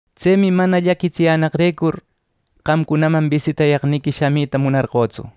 Tsemi mana llaquitsiyänaqrecur, qamcunaman bisitayaqniqui shamita munarqötsu.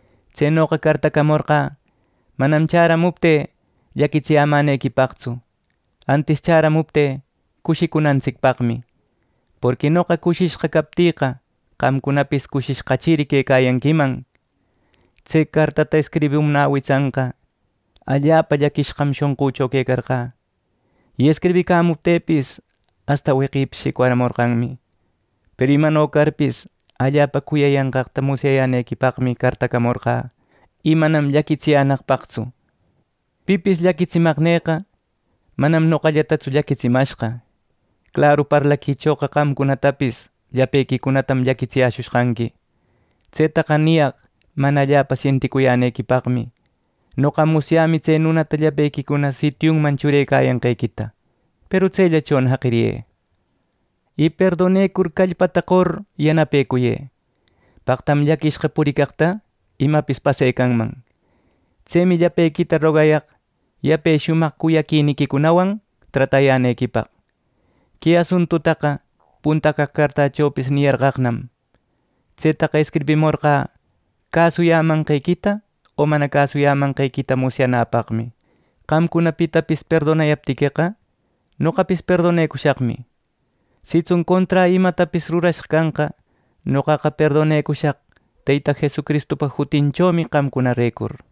Tsenoqa cartacamorqä manam chäramuptï llaquitsiyämänequipaqtsu, antis chäramuptï cushicunantsicpaqmi; porqui noqa cushishqa captïqa, qamcunapis cushishqachiri quecayanquiman. Tse cartata escribimunä witsanqa allapa llaquishqam shonqücho quecarqä y escribicamuptïpis asta weqepis shicwaramorqanmi. Peru imano carpis allapa cuyayanqaqta musyayänequipaqmi cartacamorqä, y manam llaquitsiyänaqpaqtsu. Pipis llaquitsimaqnïqa manam noqallatatsu llaquitsimashqa, claru parlaquichoqa qamcunatapis llapequicunatam llaquitsiyäshushqanqui. Tsetaqa niyaq mana allapa sienticuyänequipaqmi. Noqa musyämi tse nunata llapequicuna sitiunman churecayanqequita, peru tsellachona jaqiriyë. Y perdonecur callpata qor yanapecuyë. Paqtam llaquishqa puricaqta imapis pasecanman. Tsemi llapequita rogayaq yape shumaq cuyaquiniquicunawan tratayänequipaq. Que asuntutaqa punta caq cartächopis niyarqaqnam. Tsetaqa escribimorqä cäsuyämanqequita o mana cäsuyämanqequita musyanäpaqmi. Qamcuna pitapis perdonayaptiqueqa, noqapis perdonecushaqmi; sitsun conträ imatapis rurashqa canqa, noqaqa perdonecushaq Teyta Jesucristupa jutinchomi qamcunarecur.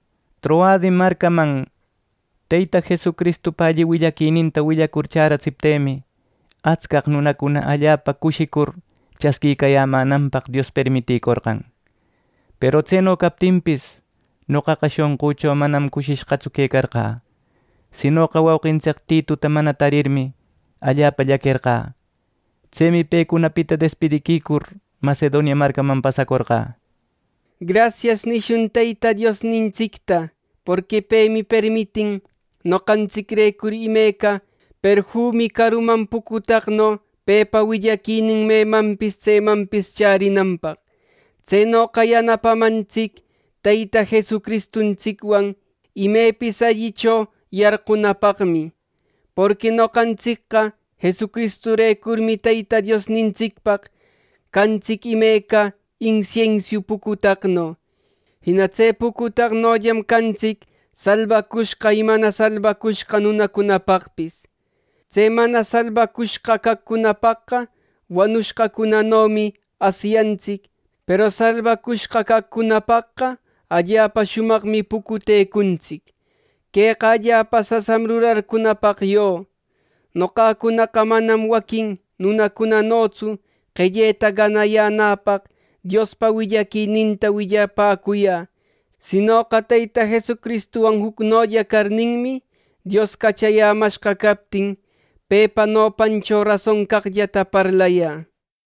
Troade marcaman Teyta Jesucristupa alli willaquininta willacur chäratsiptïmi, atscaq nunacuna allapa cushicur chasquicayämänanpaq Dios permiticorqan. Peru tseno captinpis, noqaqa shonqücho manam cushishqatsu quecarqä; sinoqa wauqintsic Tituta mana tarirmi, allapa llaquerqä. Tsemi pecunapita despidiquicur Macedonia marcaman pasacorqä. “Grasias” nicushun Teyta Diosnintsicta, porqui pemi permitin noqantsicrecur imeca perfumi caruman pucutaqno pepa willaquinin memanpis tsemanpis chärinanpaq. Tsenoqa yanapamantsic Teyta Jesucristuntsicwan imepis allicho yarqunapaqmi. Porqui noqantsicqa Jesucristurecurmi Teyta Diosnintsicpaq cantsic imeca insiensiu pucutaqno. Jina tse pucutaqnollam cantsic salbacushqa y mana salbacushqa nunacunapaqpis. Tse mana salbacushqa caqcunapaqqa, wanushqacunanomi asyantsic. Peru salbacushqa caqcunapaqqa, allapa shumaqmi pucutecuntsic. ¡Queqa allapa sasam rurarcunäpaq yo! Noqacunaqa manam waquin nunacunanotsu qelleta ganayänäpaq Diospa willaquininta willapäcuyä; sinoqa Teyta Jesucristuwan jucnolla carninmi, Dios cachayämashqa captin, pepa nopancho rason caqllata parlayä.